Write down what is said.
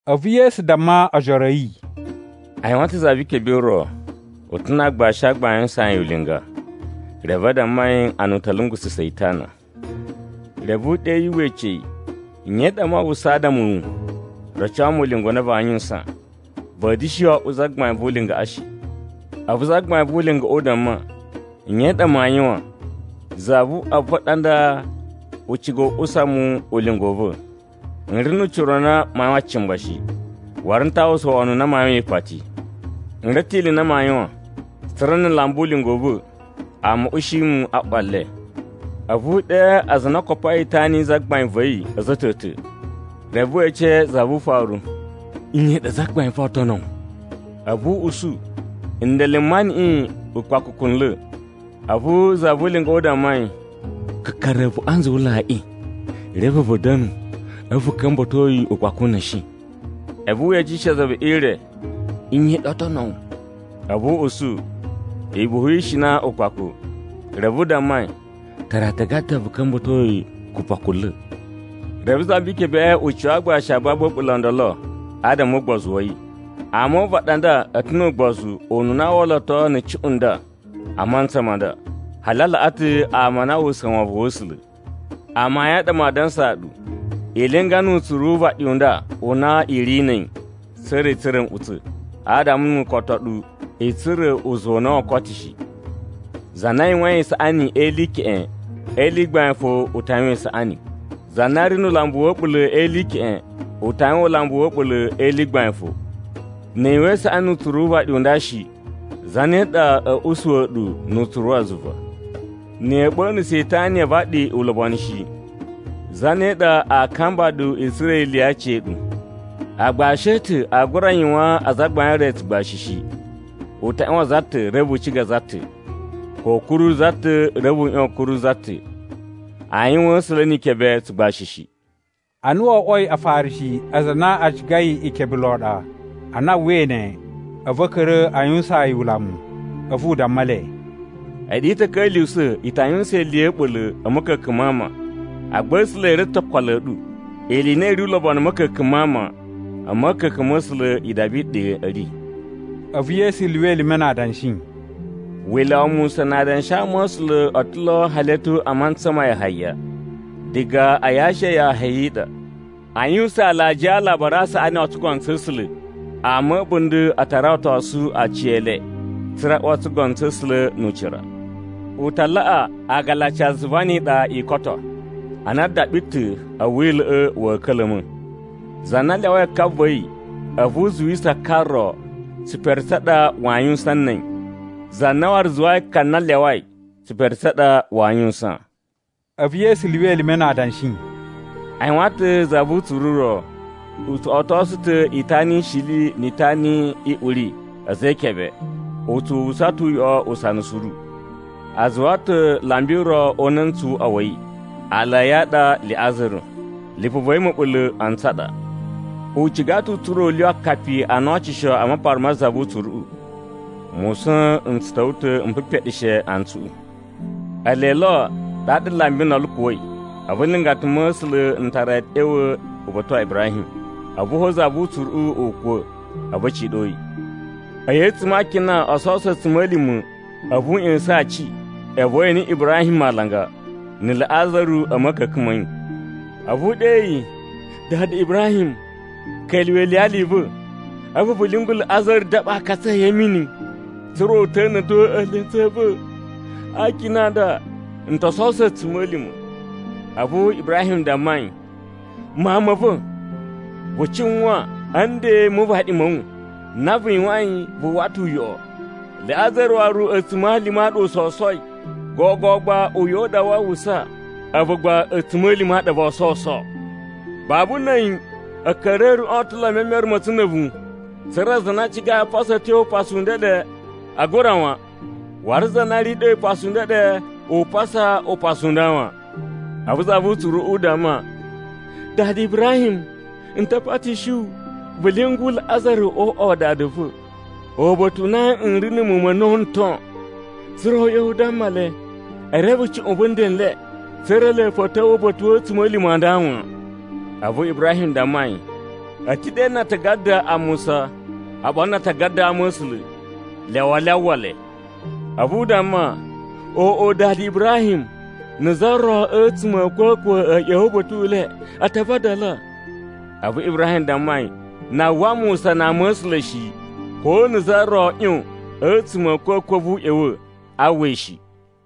A̱vu Yesu damma ojoro a̱ yi, “A yuwan ta̱ za vi ikebe i ro, u ta̱ na aagbashi a gbain a yuwusaan yi ulinga. Reve a damma yi ana u ta̱ lungususa̱ yi itana. Reve u ɗe yi we ece yi, ‘Nye i ɗa maa uwwusa adama a̱ wu? Roco mu ulinga u na vaa yuwusan. Va̱a̱ da̱shi oꞌwo zagbain vu ulingaꞌa shi.’” “A̱vu zagbain vu ulingaꞌa u damma, ‘Nye i ɗa maa yuwan? Zavuꞌwa va̱ ɗa nda u cigai u usa mu ulinga u va̱. N ri nu ucira u na maa yuwan cimba shi. Waru n ta uwwusa wono u na maa yuwan ipati. N reve ta̱ ili i na maa yuwan, tsa̱ra̱ na̱ n lamba ulinga u va̱, ama a̱ ushi mu a ꞌwa le.’ “A̱vu u ɗe aza a na o kopoi itana yi zagbain va̱ yi a̱za̱ a̱ ta̱ ta̱. Reve we ece za vu ufaru, ‘Iyan i ɗa zagbain va̱ oo tono wu?’ “A̱vu u usu, ‘Ndele m maniꞌin ukpakukunla̱.’ “A̱vu za vu ulingaꞌa u damma yi, ‘Kakara a̱a̱vuꞌun a nzuwulaiꞌi, reve vu da̱nu, a̱vu vu ka̱mba̱to yi ukpakuna̱shi.’ “A̱vu we ecishe za ve ire, ‘Iyan i ɗa oo tono wu?’ “A̱vu u usu, ‘Ibufu yi ishina ukpaku.’ “Reve u damma yi, ‘Tara aatagada vu ka̱mba̱to yi kupakunla̱.’ “Reve za vi ikebeꞌe u cuwa aagbashi a babu a̱ɓula̱ o ndolo adama o ugbozu wa̱ yi. Ama o uvaɗi a nda a̱ ta̱ nu ugbozu ununa a walato na̱ cuꞌun nda a mantsa ma nda, hali a laꞌa ta̱ ama a na a uwwusa wovon wa̱ A̱sula̱. Amayun a ɗa maa dansaa ɗu, i linga nu utsuru wu uvaɗi u nda u na i ri na̱ a̱yi, tsa̱ra̱ i tsura̱ nꞌutsa̱, adama nu u koto ɗu, i tsura̱ uzuwa u na woo koto shi. “Za na yuwain isaꞌani e ili i keꞌen, e ili i gbain fo u ta yuwan isaꞌani. Za na ri nu ulambu wa̱ a̱ɓula̱ e ili i keꞌen, u ta yuwan ulambu wa̱ a̱ɓula̱ e ili i gbain fo. Ni i yuwan isaꞌani nu utsuru wu uvaɗi u nda shi, zane ɗa a̱ usuwa̱ ɗu nu utsuru wa zuva? Na̱ ya̱a̱ ɓa̱na̱sa̱ itana ya avaɗi ulobonu shi, zane ɗa aa kamba ɗu i tsura̱ ili ya aciya̱ɗu? “Aagbashi a̱ ta̱ aa gura yuwaan azagbain e re tsugbashi shi. U ta ꞌyuwan za ta̱, reve u ciga za ta̱. Ko u kuru za ta̱, reve u ꞌyuwan a̱ kuru za ta̱. Aa yuwaan A̱sula̱ ni Ikebe tsugbashi shi.” Ana wo oꞌwoi Afarishi aza a na a cigai ikebe lon ɗa, ana a uwwai ne a̱vu a̱ ka̱ra̱ a yuwusaan yi ulamu. A̱vu u damma le, “A̱ɗu i ta̱ ka̱lyuwusa̱ i ta yuwusan ili ya̱ a̱ɓula̱ a̱ ma̱ka̱ka̱n ma ama, agba A̱sula̱ e reve ta̱ okolo a̱ ɗu. Ili i na i ri ulobonu a̱ ma̱ka̱ka̱n ma ama, a ma̱ka̱ka̱n ma̱ A̱sula̱ idaba i ɗa a̱ ri.” A̱vu Yesu lyuwa elime na adanshi, “Wila̱ wa Musa na adanshi a ama̱sula̱ o to lo hali a̱ tyo a mantsa ma Yahaya. Diga a yashi ya Yahaya i ɗa, aa yuwusan alajiya a Alabari a Saꞌani o tsugono tsa̱ A̱sula̱. Ama a̱ a̱bunda̱ a ta rawatosu aciyele, tsa̱ra̱ a uwa o tsugono tsa̱ A̱sula̱ nu ucira. U ta laꞌa agalaci a zuva ni iɗa i koto, ana daɓi ta̱ a̱ Wila̱ꞌa̱ wa̱a̱ ka̱la̱ma̱. “Za na lyawai ka va̱ yi, a̱vu u zuwisa ka ro, tsipere tsa ɗa waa yuwusan na̱ a̱yi. Za na waru zuwai ka na a lyawai, tsipere tsa ɗa waa yuwusan.” A̱vu Yesu lyuwa elime na adanshi, “A yuwan ta̱ za vu utsuru u ro, u tso otosu ta̱ itana i shili ni itana i uri a̱za̱ e ikebe, u tsu uwwusa ta̱ uyoꞌo usana suru. A zuwa ta̱ lambi ro o una̱ntsu wu uꞌwa wa̱ yi, aala a̱ yi a ɗa Liꞌazaru, lipu va̱ yi ma̱ɓula̱ antsu a ɗa. U ciga ta̱ u tsura̱ u lyuwa akapi a na o ocosu a mapara ma za vu utsuruꞌu. Musa̱n n tsu ta̱wa̱ ta̱ m pipeɗeshe antsuꞌu. “Ele lo ɗaɗa lambi ndolo u kuwa̱i, a̱vu nlingata ma̱ A̱sula̱ n tara yi a̱ ꞌya̱wa̱ uba̱ta̱ wa Ibrahim. A̱vu fo, za vu utsuruꞌu u kuwa̱, a̱vu a̱ ciɗo yi. A̱yi a̱tsuma̱ a akina o sowuso a̱tsuma̱lima̱, a̱vu u ꞌya̱sa̱n aaci, a̱vu we ene Ibrahim alanga, na̱ Liꞌazaru a̱ ma̱ka̱ka̱n ma̱ yi. A̱vu u ɗe yi, ‘Dada Ibrahim, ka̱lyuwa̱ iliyali i va̱. A̱vu vu lyungu Liꞌazaru daɓa aakatsu a̱ yi a̱ mini, tsa̱ra̱ u ta̱na̱to eelentsu a̱ va̱. A akina nda n to sowuso a̱tsuma̱lima̱.’ “A̱vu Ibrahim damma yi, ‘Mawun ma̱ va̱, vu cuwan a̱ nden mu uvaɗi ma̱ wu, na vu yuwain vu uwwa ta̱ uyoꞌo, Liꞌazaru waru a̱tsuma̱lima̱ a ɗa u sowusoi. Gogo gba uyoꞌo u ɗa waa uwwusa, a̱vu gba a̱tsuma̱lima̱ a ɗa voo sowuso. Babu na̱ a̱yi a̱a̱ka̱ri a̱ a̱ruꞌun o ta̱ lo e memere ma̱ a̱tsu na̱ a̱vu, tsa̱ra̱ aza a na a cigai a pasa a̱ tyo upasu u ndeɗe, aa gura wan. Waru za na ri ɗe upasu u ndeɗe, u pasa upasu u nda wan.’ “A̱vu za vu utsuruꞌu u damma, ‘Dada Ibrahim, n ta patishi wu, vu lyungu Liꞌazaru o uꞌwa wa dada va̱, uba̱ta̱ u na n ri na̱ muwun ma̱ a̱na̱wu n ton. Tsa̱ra̱ u ꞌya̱wa̱ u damma le e reve cuꞌun vu nden n le, tsa̱ra̱ ele fo a̱ ta̱wa̱ uba̱ta̱ wa̱ a̱tsuma̱lima̱ a nda wan.’ “A̱vu Ibrahim damma yi, ‘A̱ ta̱ ɗe na atagada a Musa oɓolo na atagada a ama̱sula̱, lyawa le a uwwa le.’ “A̱vu u damma, ‘Oꞌo, dada Ibrahim, na̱ za ro a̱tsuma̱ a̱ a̱kwa̱kwa̱ a̱ ꞌya̱wa̱ uba̱ta̱ u le, a ta vadala.’ A̱vu Ibrahim damma yi, ‘Na a uwwa Musa na ama̱sula̱ shi, ko na̱ za ro ꞌyon a̱tsuma̱ a̱ a̱kwa̱kwa̱ a̱vu u ꞌya̱wa̱, aa uwwa yi shi.’”